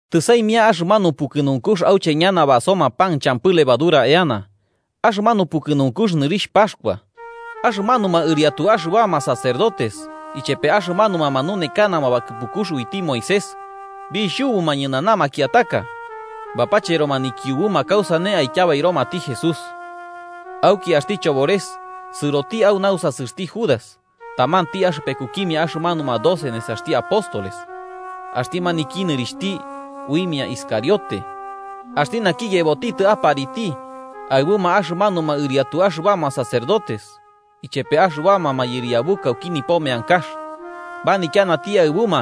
Tɨsaimia axɨmanu pukɨnunkux auche ñana basoma pan champɨ levadura eana, axɨmanu pukɨnunkux nɨrixh Paxkua. Axɨmanuma ɨriatu axɨbama sacerdotes ichepe axɨmanuma manunekanama bakɨpukux uiti Moisés, bixhubuma ñɨnana makiataka, bapacheroma nikiubuma kausane aityabairomati Jesús. Auki axti chobores sɨroti au nausasɨxti Judas, tamanti axɨpekukimia axɨmanuma doce nesaxti apóstoles, axti naki nɨrixhti uimia Iscariote. Axti naki yebotitɨ apariti aɨbuma axɨmanuma ɨriatu axɨbama sacerdotes ichepe axɨbama mayɨriabuka auki nipo meankax, manityanati aɨbuma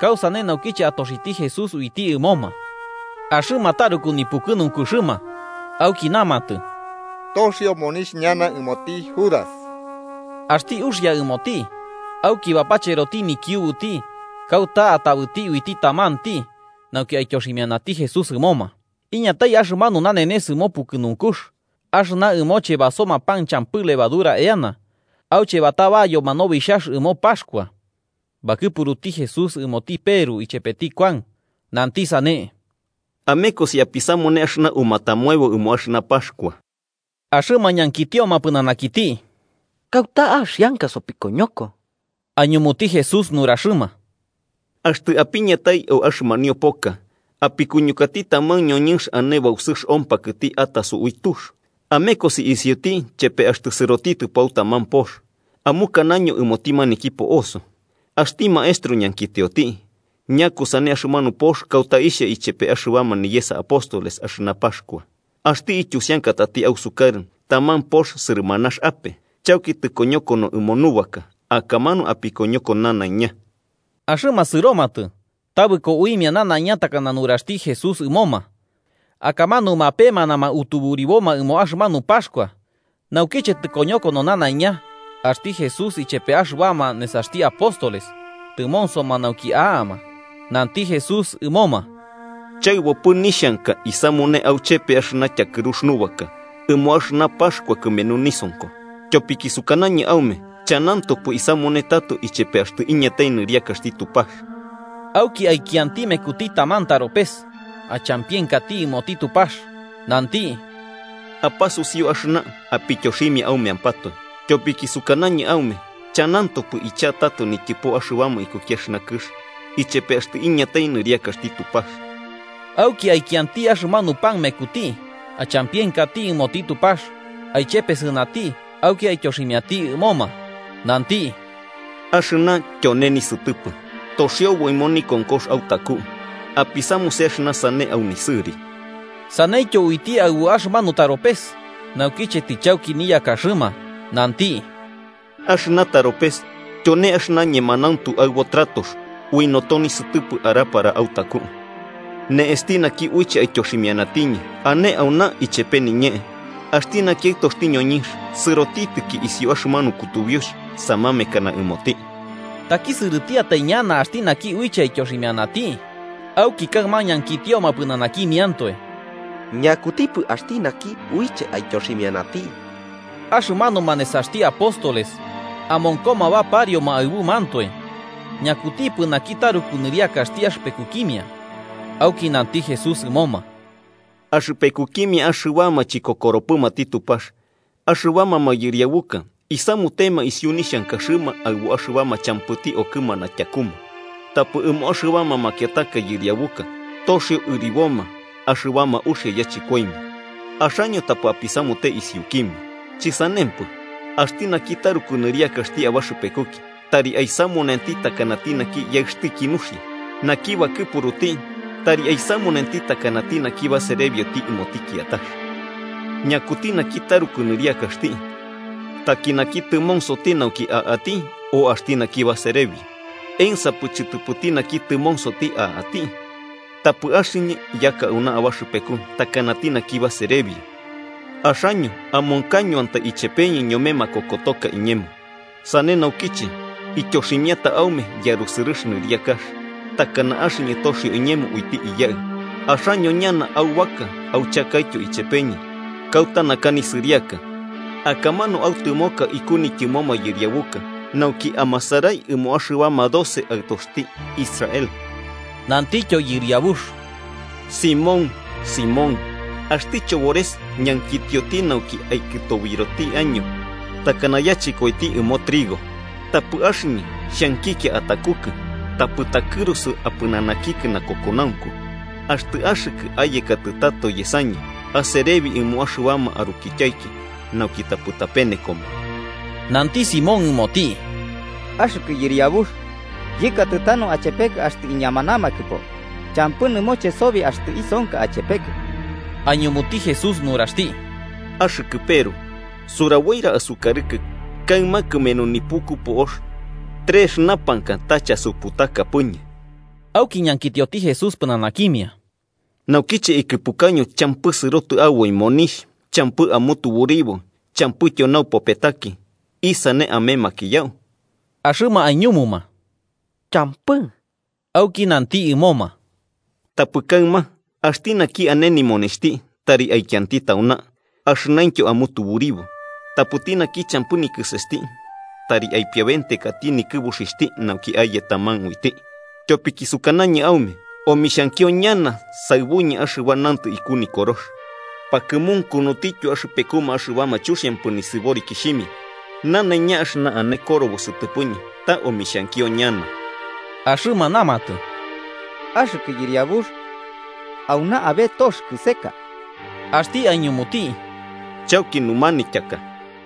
kausane nauki atoxiti Jesús uiti ɨmoma. Axɨma taruku nipukɨnunkuxɨma auki namatɨ toxio monixh ñana ɨmoti Judas. Axti uxia ɨmoti auki bapacheroti nikiubuti, kauta atabɨti uiti tamanti, nauki aityoximianati Jesús ɨmoma. Iñatai axɨmanu nanenes ɨmo pukɨnunkux axɨna ɨmoche basoma pan champɨ levadura eana, auche batabayoma nobixhax ɨmo Paxkua. Bakɨpuruti Jesús ɨmoti Peru ichepeti Kuan, nanti sane: –Amekosi apisamune axɨna umatamoebo ɨmo axɨna Paxkua. Axɨma ñankitioma pɨnanakiti: –¿Kauta axianka sopikoñoko? Aiñumuti Jesús nuraxɨma: –Axtɨ apiñatai au axɨmanio poka, apikuñukati taman ñoñɨnx ane bausɨx ompakɨti ataso ui tux. Amekosi isiuti chepe axtɨ sɨrotitɨpo au taman pox, amukanaño ɨmoti maniki po'oso: ‘Axti Maestro ñankitioti: ¿Ñakusane axɨmanu pox kauta ixha ichepe axɨbama niyesa apóstoles axɨna Paxkua?’ Axti ityusiankatati ausukarɨ taman pox sɨrɨmanax ape chauki tɨkoñokono ɨmo nubaka. Akamanu apikoñoko nanaiña. Axɨma sɨromatɨ tabɨko uimia nanaiña takana nuraxti Jesús ɨmoma, akamanu mapemanama tuburiboma ɨmo axɨmanu Paxkua. Naukiche tɨkoñokono nanaiña, axti Jesús ichepe axɨbama nesaxti apóstoles tɨmonsoma nauki a'ama. Nanti Jesús ɨmoma: –¡Chaɨbopɨ nixhanka isamune auchepe axɨna tyakɨrux nubaka ɨmo axɨna Paxkua kɨmenu nisonko! Tyopiki sukanañɨ aume chanantopɨ isamune tato ichepe axtɨ iñatai nɨriakaxti Tupax. Auki aikianti mekuti taman taropes, achampienkati ɨmoti Tupax, nanti: –Apasusiu axɨna apityoximia aumeampatoe. Tyopiki sukanañɨ aume, chanantopɨ icha'a tato nityɨpo axɨbama ikuki axɨna kɨx, ichepe axtɨ iñatai nɨriakaxti Tupax. Auki aikianti axɨmanu pan mekuti, achampienkati ɨmoti Tupax, aichepesɨnati auki aityoximiati ɨmoma, nanti: –Axɨna tyone nisɨtɨpɨ, toxiobo ɨmo nikonkox autaku. Apisamuse axɨna sane au nisɨri. Saneityo uiti aɨbu axɨmanu taropes naukiche tichauki niyakaxɨma, nanti: –Axɨna taropes tyone axɨna ñemanauntu aɨbo tratox ui noto nisɨtɨpɨ arapara autaku. Ne'esti naki uiche aityoximianañɨ ane auna, ichepe niñee. Axti naki Aɨtoxti ñoñɨnx sɨrotitɨki isiu axɨmanu kutubiux samamekana ɨmoti, ¡takisɨrɨtiatai ñana axti naki uiche aityoximianati! Auki kaɨma ñankitioma pɨnanakimiantoe ñakutipɨ axti naki uiche aityoximianati. Axɨmanuma nesaxti apóstoles amonkoma baparioma aɨbumantoe ñakutipɨ naki taruku nɨriakaxti axɨpekukimia. Auki nanti Jesús ɨmoma: “Axɨpekukimia axɨbama chikokoromatipɨ Tupax. Axɨbama mayɨriabuka isamutema isiu nixhankaxɨma aɨbu axɨbama champɨti okɨmana tyakuma, tapɨ ɨmo axɨbama makiataka yɨriabuka toxio ɨriboma axɨbama uxia yachɨkoimia. Axaño tapɨ apisamute isiukimia. Chɨsanempɨ, axti naki taruku nɨriakaxti abaxɨpekuki tari aisamunenti takanati naki yaɨxtiki nuxia, naki bakɨpuruti tari aisamunenti takanati naki baserebioti ɨmoti kiatax. ¿Ñakuti naki taruku nɨriakaxti, taki naki tɨmonsoti nauki a'ati, o axti naki baserebio? ¿Ensapɨ chɨtɨpɨti naki tɨmonsoti a'ati? Tapɨ axɨñɨ yaka auna abaxɨpeku takanati naki baserebio. “Axaño amonkañoantai ichepeñɨ ñome makokotoka iñemo. Sane naukiche, ityoximiata aume yarusɨrɨx nɨriakax, takana axɨñɨ toxio iñemo uiti Iyaɨ, axaño ñana aubaka auchakaityo ichepeñɨ kauta naka nisɨriaka, akamanu autɨmoka iku nityɨmo mayɨriabuka nauki amasarai ɨmoma axɨbama doce aɨtoxti Israel.” Nantityo Yɨriabux: –Simón, Simón, axti chobores ñankitioti nauki aikɨtobiroti año takana yachɨkoiti ɨmo trigo. Tapɨ axɨñɨ xhankikia atakukɨ, tapɨ takɨrusu apɨnanakikɨ nakokonaunku. Axtɨ axɨkɨ, ayekatɨ tato yesañɨ, aserebi ɨmo axɨbama arukityaiki nauki tapɨ tapenekoma. Nanti Simón ɨmoti: –Axɨkɨ Yɨriabux, yɨkatɨ tanu achepekɨ axtɨ iñamanamakɨpo, champɨ nɨmoche sobi axtɨ isonka achepekɨ. Aiñumuti Jesús nuraxti: –Axɨkɨ Peru, suraboira asukarɨkɨ kaɨma, kɨmenu nipuku po'ox, trex urapakai ta chasuputakapɨñɨ. Auki ñankitioti Jesús pɨnanakimia: –Naukiche ikɨpukaño champɨ sɨrotɨ aboi monixh champɨ amutuburibo champɨityo naupopetaki, ¿isane amemakiyau? Axɨma aiñumuma: –Champɨ. Auki nanti ɨmoma: –Tapɨ kaɨma, axti naki ane nimonixhti, tari aikianti tauna, axɨnaintyo amutuburibo. Tapɨti naki champɨ nikɨsesti, tari aipiabentekati nikɨbuxixhti, nauki aye taman uiti. Tyopiki sukanañɨ aume, omixhankio ñana saɨbuñɨ axɨba nantɨ iku Nikorox: ‘Pakɨmunkunutityo axɨpekuma axɨbama chuxiampɨ nisɨborikixhimia.’ Nanaiña axɨna ane korobo sɨtɨpɨñɨ, ta omixhankio ñana. Axɨma namatɨ: –Axɨkɨ Yɨriabux, auna abe tox kɨseka. Axti aiñumuti: –Chauki numanityaka.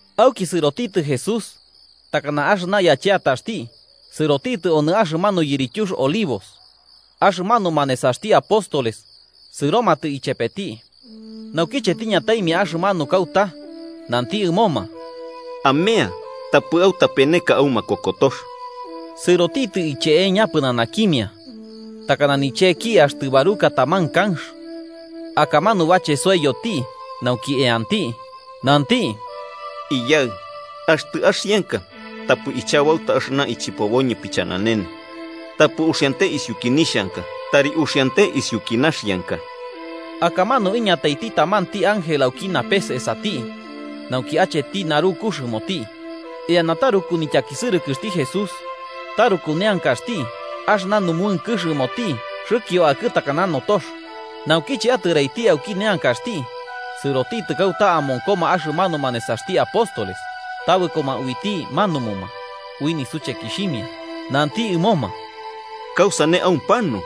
Auki sɨrotitɨ Jesús, takana axɨna yacheataxti, sɨrotitɨ onɨ axɨmanu yirityux Olivos. Axɨmanuma nesaxti apóstoles sɨromatɨ ichepeti. Naukiche tiñataimia axɨmanu kauta, nanti ɨmoma: –Amea, tapɨ autapeneka au makokotox. Sɨrotitɨ iche'eña pɨnanakimia takana nicheki axtɨ baruka taman kanx, akamanu bachesoiyoti nauki eanti. Nanti: “Iyaɨ, axtɨ axianka, tapɨ ichabauta axɨna ichɨpoboñɨ pichananene. Tapɨ uxiante isiuki nixhanka, tari uxiante isiuki naxianka.” Akamanu iñataiti tamanti ángel auki napes esati, nauki acheti narukux ɨmoti. Eana taruku nityakisɨrɨkɨxti Jesús, taruku neankaxti, axɨna numuɨnkɨx ɨmoti xɨkio akɨ takana notox. Naukiche atɨraiti auki neankaxti, sɨrotitɨ kauta amonkoma axɨmanuma nesaxti apóstoles, tabɨkoma uiti manumuma, ui nisuchekixhimia. Nanti ɨmoma: –¿Kausane aumpanu?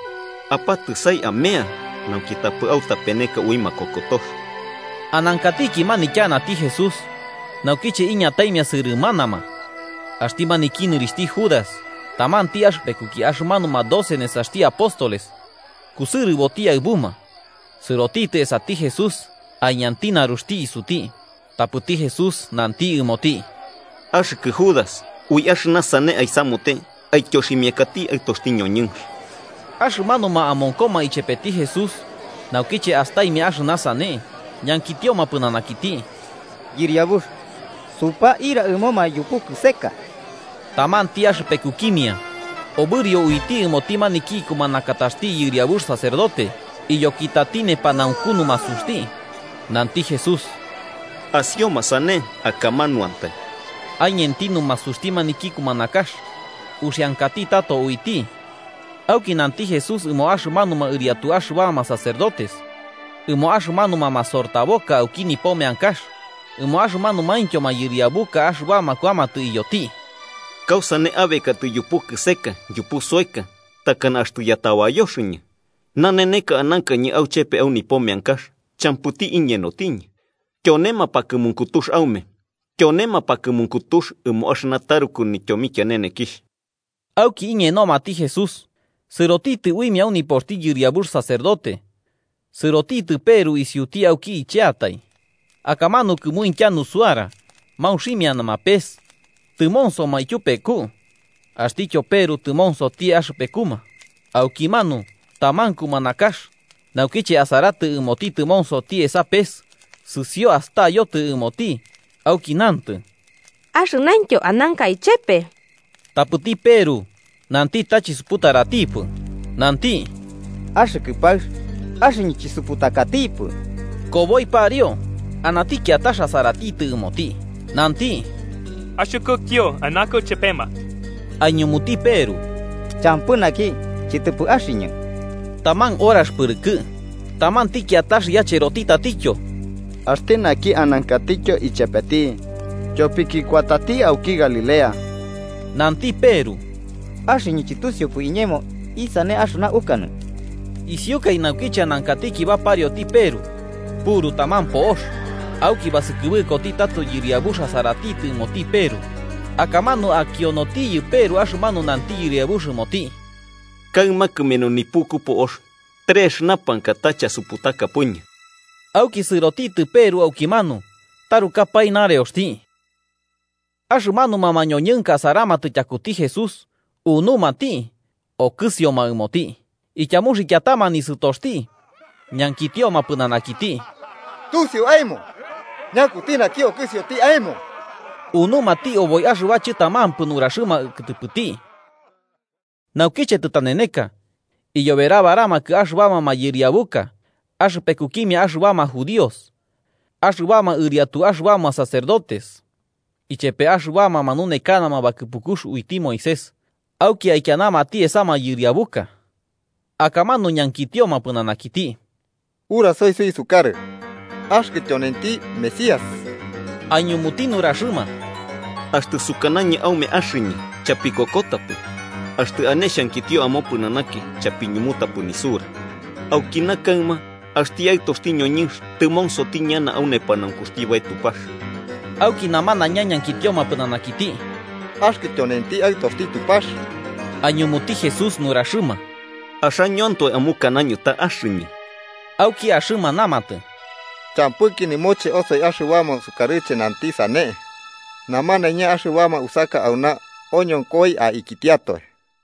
Apatɨsai amea, nauki tapɨ autapeneka ui makokotox. Anankatiki manityanati Jesús, naukiche iñataimia sɨrɨmanama. Axti maniki nɨrixhti Judas, tamanti axɨpekuki axɨmanuma doce nesaxti apóstoles, kusɨrɨboti aɨbuma. Sɨrotitɨ esati Jesús aiñanti naruxti isuti, tapɨti Jesús nanti ɨmoti: –Axɨkɨ Judas, ¿ui axɨna sane aisamute aityoximiakati Aɨtoxti ñoñɨnx? Axɨmanuma amonkoma ichepeti Jesús, naukiche astaimia axɨna sane, ñankitioma pɨnanakiti: –Yɨriabux, ¿supaira ɨmoma yupu kɨseka? Tamanti axɨpekukimia obɨrio uiti ɨmoti maniki ikumanakataxti yɨriabux sacerdote, iyokitati nepanaunku numasuxti. Nanti Jesús: –Asioma sane. Akamanuantai. Aiñenti numasuxti maniki kumanakax, uxiankati tato uiti. Auki nanti Jesús ɨmo axɨmanuma ɨriatu axɨbama sacerdotes, ɨmo axɨmanuma masortaboka auki nipo meankax ɨmo axɨmanumaintyo mayɨriabuka, axɨbama kuamatɨ iyoti: –¿Kausane abekatɨ yupu kɨseka yupu soeka, takana axtɨ yatabayoxɨñɨ? Naneneka anankañɨ auchepe au nipo meankax, champɨti iñenotiñɨ. Tyone mapakɨmunkutux aume, tyone mapakɨmunkutux ɨmo axɨna taruku nityomikianenekixh. Auki iñenomati Jesús sɨrotitɨ uimia au nipoxti yɨriabux sacerdote. Sɨrotitɨ Peru isiuti auki icheatai. Akamanu, kɨmuintya nusuara maunximianama pes, tɨmonsoma ityupeku. Axtityo Peru tɨmonsoti axɨpekuma. Aukimanu, taman kumanakax, naukiche asaratɨ ɨmoti tɨmonsoti esa pes, sɨsio astayotɨ ɨmoti auki nantɨ: –Axɨnaintyo ananka ichepe. Tapɨti Peru nanti ta chisuputaratipɨ, nanti: –Axɨkɨ paɨx, axɨñɨ chisuputakatipɨ. Koboi pariu, anati kiatax asaratitɨ ɨmoti nanti: –Axɨkɨtyo anankɨ chepema. Aiñumuti Peru: –Champɨ, naki, chɨtɨpɨ axɨñɨ. Taman horax pɨrɨkɨ, tamanti kiatax yachɨroti tatityo: –Axti naki anankatityo ichepeti. Tyopiki kuatati auki Galilea. Nanti Peru: –Axɨñɨ, chɨtusiupɨ iñemo isane axɨna ukanɨ. Isiukai, naukiche anankatiki baparioti Peru, puru taman po'ox. Auki basɨkɨbɨkoti tato Yɨriabux asaratitɨ ɨmoti Peru, akamanu akionotiyɨ Peru axɨmanu nanti Yɨriabux ɨmoti: “Kaɨma, kɨmenu nipuku po'ox, trex urapakai ta chasuputakapɨñɨ.” Auki sɨrotitɨ Peru aukimanu tarukapae nareoxti. Axɨmanuma mañoñɨnka asaramatɨ tyakuti Jesús unumati okɨsioma ɨmoti. Ityamuxiankatama nisɨtoxti, ñankitioma pɨnanakiti: –¡Tusio aemo ñakuti naki okɨsioti aemo! Unumati oboi axɨba chɨtamampɨ nuraxɨma kɨtɨpɨti. Naukiche tɨtaneneka, iyoberabaramakɨ axɨbama mayɨriabuka axɨpekukimia axɨbama judíos, axɨbama ɨriatu axɨbama sacerdotes ichepe axɨbama manunekanama bakɨpukux uiti Moisés, auki aikianamati esa mayɨriabuka. Akamanu ñankitioma pɨnanakiti: 67–Urasoi suisukarɨ, ¿axɨkɨ tyonenti Mesías? Aiñumuti nuraxɨma: –Axtɨ sukanañɨ aume axɨñɨ, chapikokotapɨ. Axtɨ ane xhankitio amopɨnanaki, chapiñumutapɨ nisura. Aukina kaɨma axti Aɨtoxti ñoñɨnx tɨmonsoti ñana au nepanaunkuxti Bae Tupax. Auki namanaiña ñankitioma pɨnanakiti: –¿Axɨkɨ tyonenti Aɨtoxti Tupax? Aiñumuti Jesús nuraxɨma: –Axañoantoe amukanaño ta axɨñɨ. Auki axɨma namatɨ: –¿Champɨki nɨmoche osoi axɨbama sukarɨche nanti sane? Namanaiña axɨbama usaka auna oñonkoi aikitiatoe.